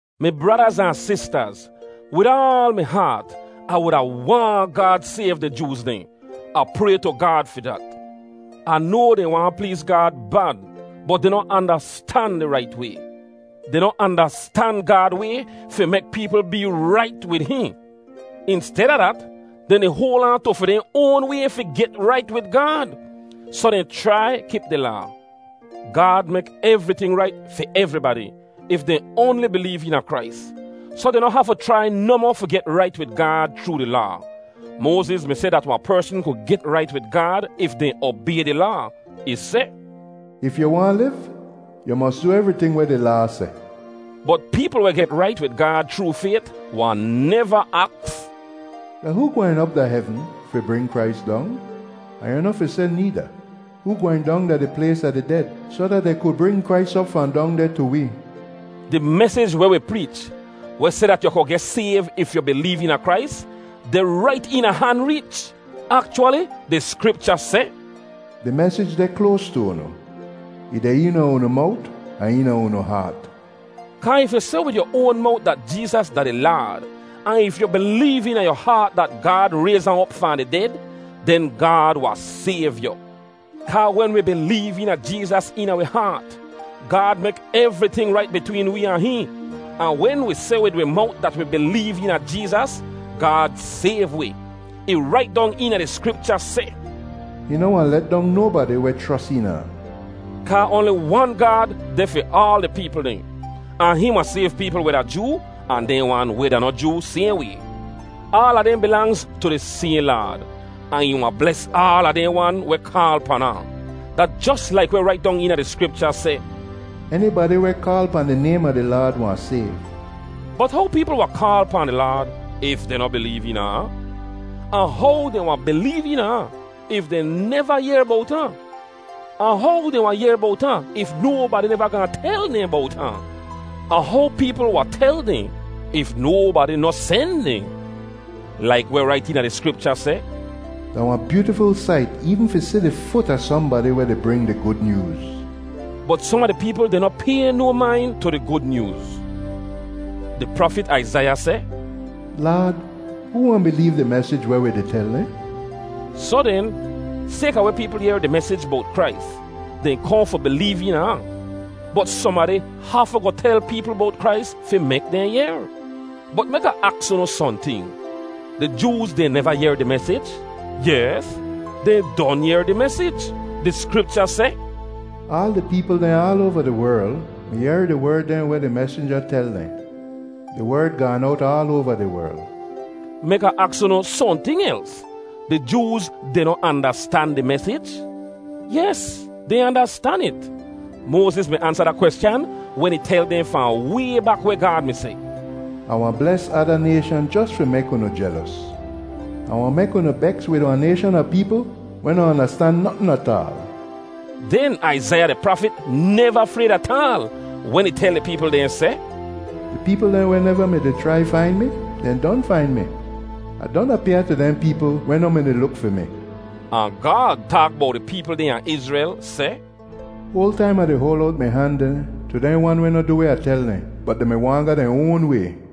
Mi bradaz ahn sistaz, wid aal mi haat, Ah wuda waahn Gaad sayv di Jooz dehn. Ah pray tu Gaad fi dat. Ah noa dehn waahn pleez Gaad bad, bot dehn noh andastan di rait way. Dehn noh andastan Gaad way fi mek peepl bee rait wid hihn. Insteda dat, dehn di hoal aan tu fi dehn oan way fi get rait wid Gaad, soh dehn chrai kip di Laa. Gaad mek evriting rait fi evribadi, if dehn oanli bileev eena Krais. Soh dehn noh hafu chrai nohmoh fi get rait wid Gaad chroo di Laa. Moaziz mi seh dat wahn persn ku get rait wid Gaad if dehn obay di Laa. Ih seh, “If yu waahn liv, yu mos du evriting weh di Laa seh.” Bot peepl weh get rait wid Gaad chroo fayt wahn neva aks, “Da hoo gwehn op da hevn (fi bring Krais dong)?” Ahn yu noh fi seh needa, “Hoo gwehn dong da di plays a di ded (soh dat dehn ku bring Krais op fahn dong deh tu wee)?” Di mesij weh wi preech, weh seh dat yu ku geh sayv if yu bileev eena Krais, deh rait eena han reech. Akchwali, di Skripcha seh, “Di mesij deh kloas tu unu, ih deh eena unu mowt ahn eena unu haat.” Kaa if yu seh wid yu oan mowt dat Jeezas da di Laad, ahn if yu bileev eena yu haat dat Gaad rayz ahn op fahn di ded, den Gaad wahn sayv yu. Kaa wen wi bileev eena Jeezas eena wi haat, Gaad mek evriting rait bitween wee ahn hihn. Ahn wen wi seh wid wi mowt dat wi bileev eena Jeezas, Gaad sayv wi. Ih rait dong eena di Skripcha seh, “Hihn noh wahn let dong nobadi weh chros eena ahn.” Kaa oanli wan Gaad deh fi aal di peepl dehn, ahn hihn wahn sayv peepl weh da Joo ahn dehn wan weh da noh Joo sayhn way. Aala dehn bilangz tu di sayhn Laad, ahn ih wahn bles aala dehn wan weh kaal pan ahn. Da jos laik weh rait dong eena di Skripcha seh, “Enibadi weh kaal pahn di naym a di Laad wahn sayv.” Bot how peepl wahn kaal pahn di Laad if dehn noh bileev eena ahn? Ahn how dehn wahn bileev eena ahn if dehn neva yehr bowt ahn? Ahn how dehn wahn yehr bowt ahn if nobadi neva gaahn tel dehn bowt ahn? Ahn how peepl wahn tel dehn if nobadi noh sen dehn? Laik weh rait eena di Skripcha seh, “Da wahn byootiful sait eevn fi si di fut a sohnbadi weh di bring di Gud Nyooz.” Bot som a di peepl dehn noh pay no main tu di Gud Nyooz. Di prafit Aizaiya seh, “Laad, hoo wahn bileev di mesij weh wi di tel dehn?” Soh den, sayka weh peepl yehr di mesij bowt Krais, dehn kohn fi bileev eena ahn, bot sohnbadi hafu goh tel peepl bowt Krais fi mek dehn yehr. Bot mek Ah aks unu sohnting: Di Jooz dehn neva yehr di mesij? Yes, dehn don yehr di mesij. Di Skripcha seh, “Aal di peepl dehn aal oava di werl mi yehr di werd dehn weh di mesinja tel dehn. Di werd gaan owt aal oava di werl.” Mek Ah aks unu sohnting els: Di Jooz dehn noh andastan di mesij? Yes, dehn andastan it. Moaziz mi ansa da kweschan wen ih tel dehn fahn way bak weh Gaad mi seh, “Ah wahn bles ada nayshan jos fi mek unu jelos. Ah wahn mek unu beks wid wahn nayshan a peepl weh noh andastan notn ataal.” Den Aizaiya di prafit neva frayd ataal wen ih tel di peepl dehn seh, “Di peepl dehn weh neva mi-di chrai fain mi, dehn don fain mi. Ah don apyaa tu dehn peepl weh noh mi-di luk fi mi.” Ahn Gaad taak bowt di peepl dehn a Izrel seh, “Hoal taim Ah di hoal owt mi han dehn tu dehn wan weh noh du weh Ah tel dehn, bot dehn mi waahn ga dehn oan way.”